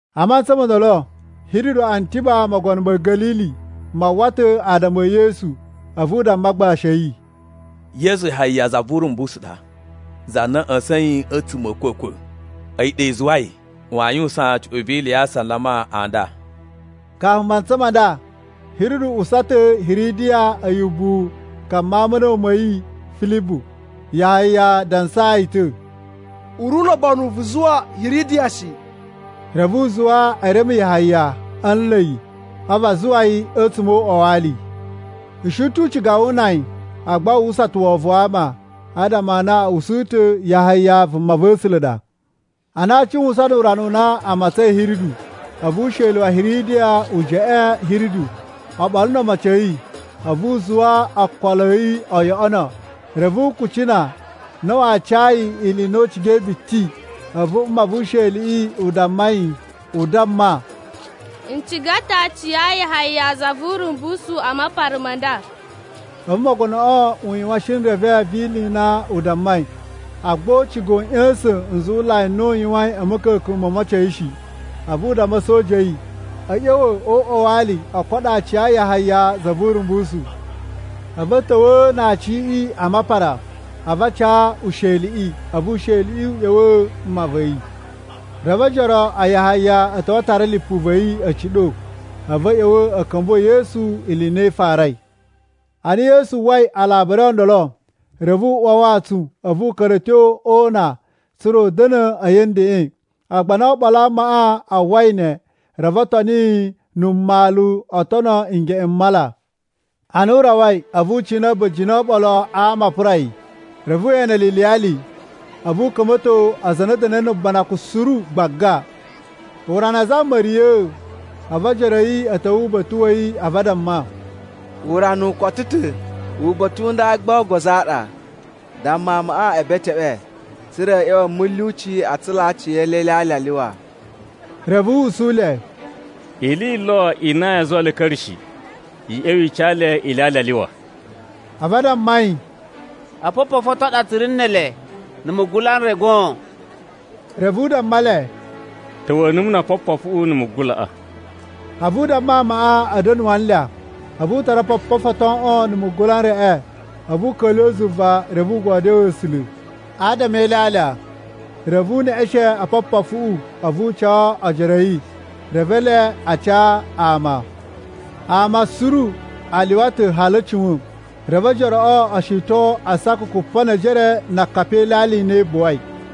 A mantsa mo ndolo, Hiridu Antiba, mogono ma̱ Ga̱lili, ma uwwa ta̱ adama e Yesu. A̱vu u damma agbashi a̱ yi, “Yesu Yahaya za vu Urumbusu ɗa, za na a̱ ꞌya̱sa̱in a̱tsuma̱ a̱ a̱kwa̱kwa̱. A̱yi ɗa i zuwai waa yuwusan cuꞌun vi ili ya asalama a nda.” Kafu mantsa ma nda, Hiridu usa ta̱ Hiridiya a̱yi ubuwu ka mawun ma̱ a̱na̱wu ma̱ yi Filibu. Yahaya dansaa yi ta̱, “U ri ulobonu vu zuwa Hiridiya shi!” Reve u zuwa e reme Yahaya a̱ nla̱ yi, a̱vu a zuwa yi a̱tsuma̱ o uꞌwa wa ali. U shi ta̱ u ciga wu una yi, agba wu uwwusa ta̱ wovon wa ama, adama a na a̱ usu ta̱ Yahaya vumava̱sula̱ ɗa. Ana a cuwusan nu urana u na a matsain Hiridu, a̱vu usheli wa Hiridiya u jeꞌeen Hiridu oɓolo no omocin a̱ yi, a̱vu u zuwa okolo a̱ yi o yoꞌono. Reve u kucina na waa ca yi ili i na u cigai biti. A̱vu mma vu usheliꞌi u damma yi u damma, “N ciga ta̱ aaci a Yahaya za vu Urumbusu a mapara ma nda!” A̱vu mogonoꞌo u yuwan shinreve vi ili i na u dammai. Agba u ciga u ꞌya̱sa̱n nzuwulai n na u yuwain a̱ ma̱ka̱ka̱n mo omocin a̱ yi shi. A̱vu u damma a̱soja a̱ yi, a̱ ꞌya̱wa̱ o uꞌwa wa ali o koɗo aaci a Yahaya za vu Urumbusu. A̱vu a̱ ta̱wa̱a̱ na aaciꞌi a mapara a̱vu a ca usheliꞌi, a̱vu usheliꞌi u ꞌya̱wa̱a̱ mma va̱ yi. Reve ojoro a Yahaya a̱ ta̱wa̱ a tara lipu va̱ yi a̱ ciɗo. A̱vu a̱ ꞌya̱wa̱ a̱ ka̱mbuwa̱ Yesu ili i na i farai. Ana Yesu uwwai alabari o ndolo, reve u uwa a wantsun, a̱vu u ka̱ra̱ a̱ tyo o una tsa̱ra̱ u da̱na̱ a̱yi a̱ ndeꞌen. Agba ana oɓolo a amaꞌa a uwwai ne, reve o toni yi na̱ mmalu o tono ngeꞌen m mala. Ana u rawai, a̱vu u cina a̱ba̱jini o oɓolo a ama a pura yi. Reve we ene le iliyali, a̱vu u ka̱mba̱to aza a na a̱ da̱na̱i ubanakun suru gbaga. Urana a zama ma̱riya̱a̱, a̱vu ojoro a̱ yi a̱ ta̱wa̱ uba̱ta̱ wa̱ yi a̱vu a damma, “Urana u koto ta̱, uba̱ta̱ u nda gba ogozo a ɗa. Damma amaꞌa e beteꞌwe, tsa̱ra̱ a̱ ꞌya̱wa̱ a̱ mulyuci a tsulaa aciyele ilyalya a lyuwa.” Reve u usu le, “Ili yi lo i na yaa zuwa le a̱ ka̱ra̱ shi. I ꞌya̱wa̱ i ca le ilyalya a lyuwa.” A̱vu a damma yi, “Opopofu o ton a ɗa tsu ri ne ele na̱ mugula n re goon.” Reve u damma le, “Ta̱wa̱a̱ numu no opopofuꞌu na̱ mugulaꞌa.” A̱vu u damma amaꞌa a̱ da̱nu a anlya. A̱vu u tara opopofu o toꞌon na̱ mugula n reꞌe, a̱vu u ka̱lyuwa̱ zuva, reve u godyoo A̱sula̱ adama e ilyalya. Reve u neꞌeshen opopofuꞌu, a̱vu u ca ojoro a̱ yi, reve ele a ca ama. Ama suru a lyuwa ta̱ hali a̱ cuwa̱n. Reve ojoroꞌo o shiton asaka kupa ne ejere na akapi e ilyalya i na i buwai.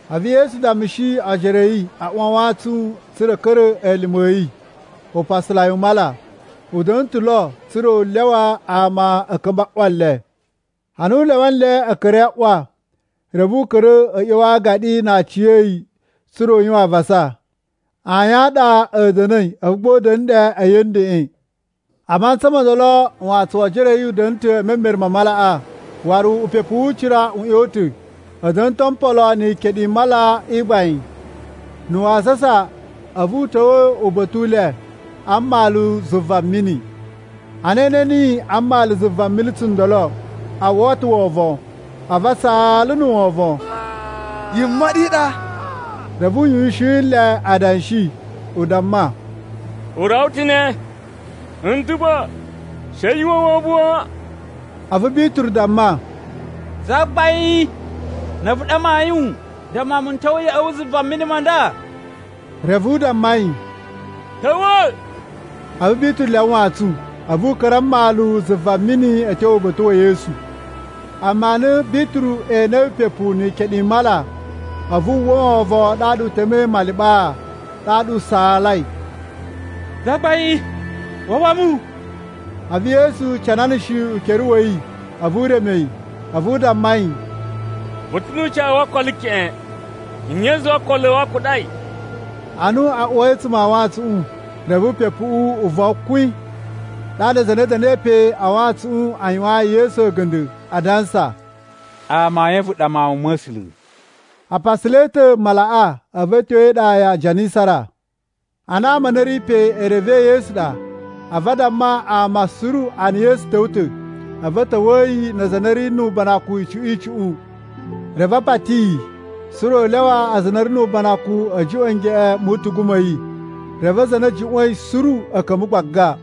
A̱vu Yesu dammushi ojoro a̱ yi a uwa a wantsun tsa̱ra̱ a̱ ka̱ra̱ elime a̱ yi upasalai u mala. U da̱na̱ ta̱ lo tsa̱ra̱ u lyawa ama a̱ ka̱mba̱ a ꞌwa le. Ana u lyawa nle a̱ ka̱ra̱i a ꞌwa, reve u ka̱ra̱ a̱ ꞌya̱wa̱ a agaɗi na aciya̱yi tsa̱ra̱ u yuwan avasa. Ayin a ɗa a̱ da̱na̱i, a̱vu gba u da̱na̱ ɗe a̱yi a̱ ndeꞌen. A matsan mo ndolo, wantsun wo ojoro a̱ yi u da̱na̱ ta̱ e memere ma malaꞌa, waru upepu wu ucira u ꞌyon ta̱. A̱ da̱na̱ ta̱ o mpolo ni ikeɗu i mala i gbain. Na̱ wasasa, a̱vu u ta̱wa̱ uba̱ta̱ u le a mmalu zuva mini. Ana e ene niyi a mmalu zuva mini tsundolo, a uwwa ta̱ wovon. A̱vu a saala na̱ wovon, “Yimoɗi i ɗa!” Reve u yuwushin nle adanshi, u damma, “U rawa ta̱ ne, n ta̱ pa! She yu uwwa wovon wan.” A̱vu Bituru damma, “Zagbain, na̱ a̱vu ɗa mayun, damma mu n ta̱wa̱ ya̱ꞌa̱ wu zuva mini ma nda.” Reve u damma yi, “Ta̱wa̱.” A̱vu Bituru lyawa wantsun, a̱vu u ka̱ra̱ a mmalu zuva mini a̱ tyo uba̱ta̱ wa̱ Yesu. Amma ana Bituru enei upepu ni ikeɗu i mala, a̱vu wu uwwa wovon ɗaɗa u temei maliɓaa. Ɗaɗa u saalai, “Zagbain, wawa mu!” A̱vu Yesu cananashi ukere wa̱ yi a̱vu u reme yi. A̱vu u damma yi, “Vu ta̱ nu ucawu wo okolo keꞌen. Nye i zuwai okolo a̱ wu a kuɗai?” Ana a uwai a̱tsuma̱ a wantsuꞌun, reve upepuꞌu u von kwin. Ɗaɗa aza a na a̱ da̱na̱i pe a wantsuꞌun a yuwayin Yesu a̱ga̱nda̱ adansa, “Amayun a̱vu ɗa Mawun ma̱ A̱sula̱.” A pasalai ta̱ malaꞌa a̱vu a̱ tyo e iɗa ya Janisara. Ana ama a na a̱ ri pe e revei Yesu ɗa, a̱vu a damma ama suru a na Yesu ta̱wa̱ ta̱. A̱vu a̱ ta̱wa̱a̱ yi na aza a na a̱ ri nu ubanakun icuꞌun icuꞌun. Reve a pati yi tsa̱ra̱ u lyawa aza a na a̱ ri nu ubanakun a̱ juꞌwa̱n ngeꞌen mu utugu ma̱ yi. Reve aza a na a̱ juꞌwa̱in suru a̱ ka̱mba̱ gbaga.